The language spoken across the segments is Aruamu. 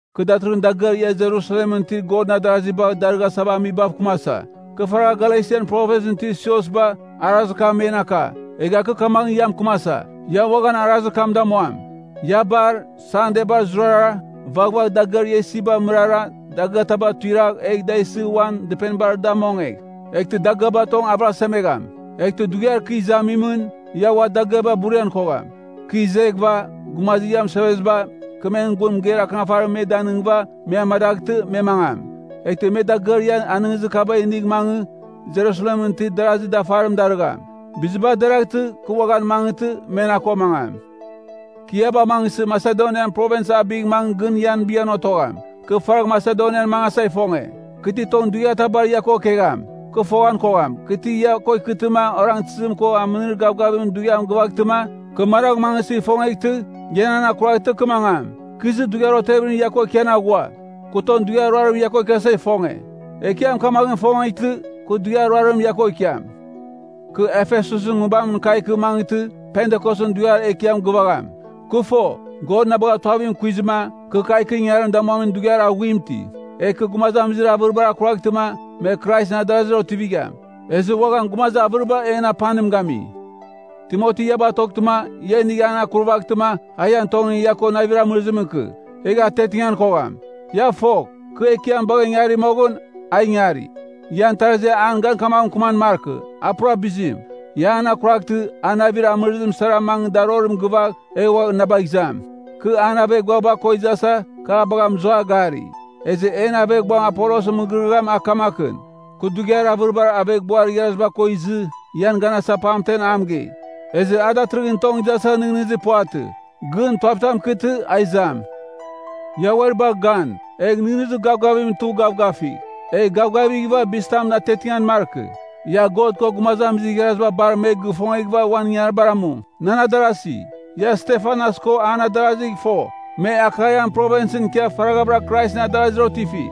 Kɨ datɨrɨghɨn dagɨar ia Jerusalemɨn itir Godɨn adarasi bagha darɨghasava amibav kɨmasa. Kɨ faragha Galesian Provinsɨn itir siosba, arazir kam men aka, egha kɨ kamaghɨn ia mɨkɨmasa, ia uaghan arazir kam damuam. Ia bar, Sandebar zurara, vaghvagh dagɨar ia isiba mɨrara, dagɨataba tuiragh, egh da isɨ uan dɨpenibar da mongegh. Eghtɨ dagɨaba tong avɨrasemegham. Eghtɨ dughiar kɨ izamimɨn, ia ua dagiaba burian kogham. Kɨ izeghɨva, gumazir ia mɨseveziba, kɨ men gun mɨgeir akɨnafarim me danɨngɨva, me amadaghtɨ, me mangam. Eghtɨ me dagɨar ia anɨngizir kaba inigh mangɨ Jerusalemɨn itir darazir dafarim darɨgham. Biziba deraghtɨ, kɨ uaghan mangɨtɨ, me na ko mangam. Kɨ ia bagh mangɨsɨ, Masedonian Provins abigh mangɨgh, gɨn ian bighan otogham. Kɨ faragh Masedonian mangasa ifonge. Kɨ ti tong dughiatabar ia ko ikegham, kɨ foghan kogham, kɨ ti ia ko ikɨtɨma orangtɨzim ko aminir gavgavimɨn dughiam gɨvaghtɨma, kɨ managh mangɨsɨ ifongeghtɨ, ia nan akuraghtɨma kɨ mangam. Kɨ izɨ, dughiar otevimɨn ia ko ikian aghua. Kɨ tong dughiar ruarimɨn ia ko ikiasa ifonge. Ekiam kamaghɨn ifongeghtɨ, kɨ dughiar ruarim ia ko ikiam. Kɨ Efesusɨn Nguibamɨn kagh ikɨ mangɨtɨ, Pentikosɨn Dughiar Ekiam gɨvagham. Kɨ fo, God na bagha tuavim kuizɨma, kɨ kagh ikɨ ingangarim damuamin dughiar aghuim iti. Egh kɨ gumazamizir avɨribar akuraghtɨma, me Kraisɨn adarazir otivigham. Ezɨ uaghan gumazir avɨriba en apanim gami. Timoti ia batoghtɨma, ia a inigh an akurvaghtɨma, a ian tongɨn ia ko navir amɨrɨzimɨn ikɨ, egh atiatingan kogham. Ia fogh, kɨ Ekiam bagha ingari moghɨn, a ingari. Ian tarazi an gan kamaghɨn mɨkɨman markɨ, a pura bizim. Ia an akuraghtɨ, a navir amɨvɨzim sara mangɨ darorim gɨvagh, egh ua na bagh izam. Kɨ, an aveghbuaba ko izasa, kɨ a bagha mɨzua gari. Ezɨ en aveghbuam Apolosɨn mɨgɨrɨgɨam a kamakɨn. Kɨ dughiar avɨribar aveghbuar igharaziba ko izɨ, ian ganasa pamtemɨn a mɨgei. Ezɨ a datɨrɨghɨn tong izasa nɨghnɨzir puvatɨ. Gɨn, tuavitam ikɨtɨ, a izam. Ia uari bagh gan, egh nɨghnɨzir gavgavimɨn tugh gavgafigh. Egh gavgavighɨva bizitamɨn atiatingan markɨ. Ia God ko gumazamizir igharaziba bar me gɨfongeghɨva uan ingangaribar amu. Nan adarasi, ia Stefanas ko an adarazigh fo. Me Akaian Provinsɨn ikia faraghavɨra Kraisɨn adarazir otifi,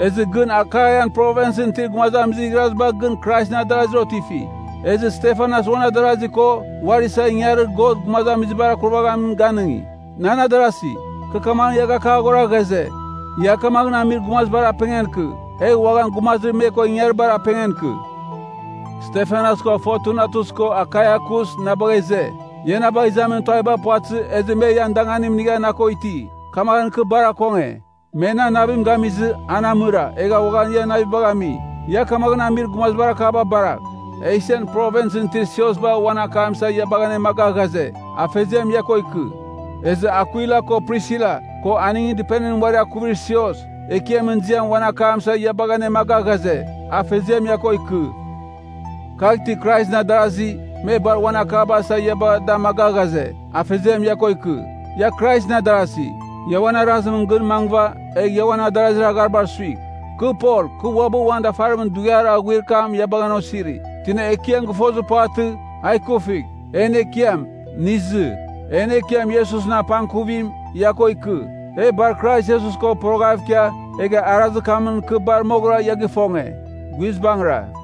ezɨ gɨn Akaian Provinsɨn itir gumazamizir igharaziba gɨn Kraisɨn adarasi otifi. Ezɨ Stefanas uan adarazir ko, uari isa ingangarir Godɨn gumazamizibar akurvaghamim ganɨngi. Nan adarasi, kɨ kamaghɨn ia gakaghora ghaze, ia kamaghɨn amir gumazibar apengan ikɨ, egh uaghan gumazir me ko ingaribar apengan ikɨ. Stefanas ko Fortunatus ko Akaikus na bagha ize. Ia na bagh izamin tuaviba puvatɨzɨ, ezɨ me ian danganim inigha na ko iti. Kamaghɨn kɨ bar akonge. Me nan navim gamizɨ, an amɨra, egha uaghan ian navibagh ami. Ia kamaghɨn amir gumazibar akaba baragh. Esian Provinsɨn itir siosba uan akam isa ia bagha anemaga ghaze, Afeziam ia ko ikɨ. Ezɨ Akwila ko Prisila, ko aningɨn dɨpenimɨn uari akuvir sios, Ekiamɨn ziamɨn uan akam isa ia bagha anemaga ghaze, Afeziam ia ko ikɨ. Kagh itir Kraisɨn adarazi, me bar uan akaba isa ia bagha da amaga ghaze, Afeziam ia ko ikɨ. Ia Kraisɨn adarasi, ia uan arazimɨn gɨn mangɨva, egh ia uan adarazir agharibar suigh. Kɨ Pol, kɨ uabɨ uan dafarimɨn dughiar aghuir kam ia bagha an osiri. Tina Ekiam gɨfongezir puvatɨ, a ikuvigh. En Ekiam, nɨ izɨ! En Ekiam Iesusɨn apangkuvim, ia ko ikɨ. E bar Krais Iesus ko poroghav ikia, egha arazir kamɨn kɨ bar moghɨra ia gɨfonge. Guizbangɨra.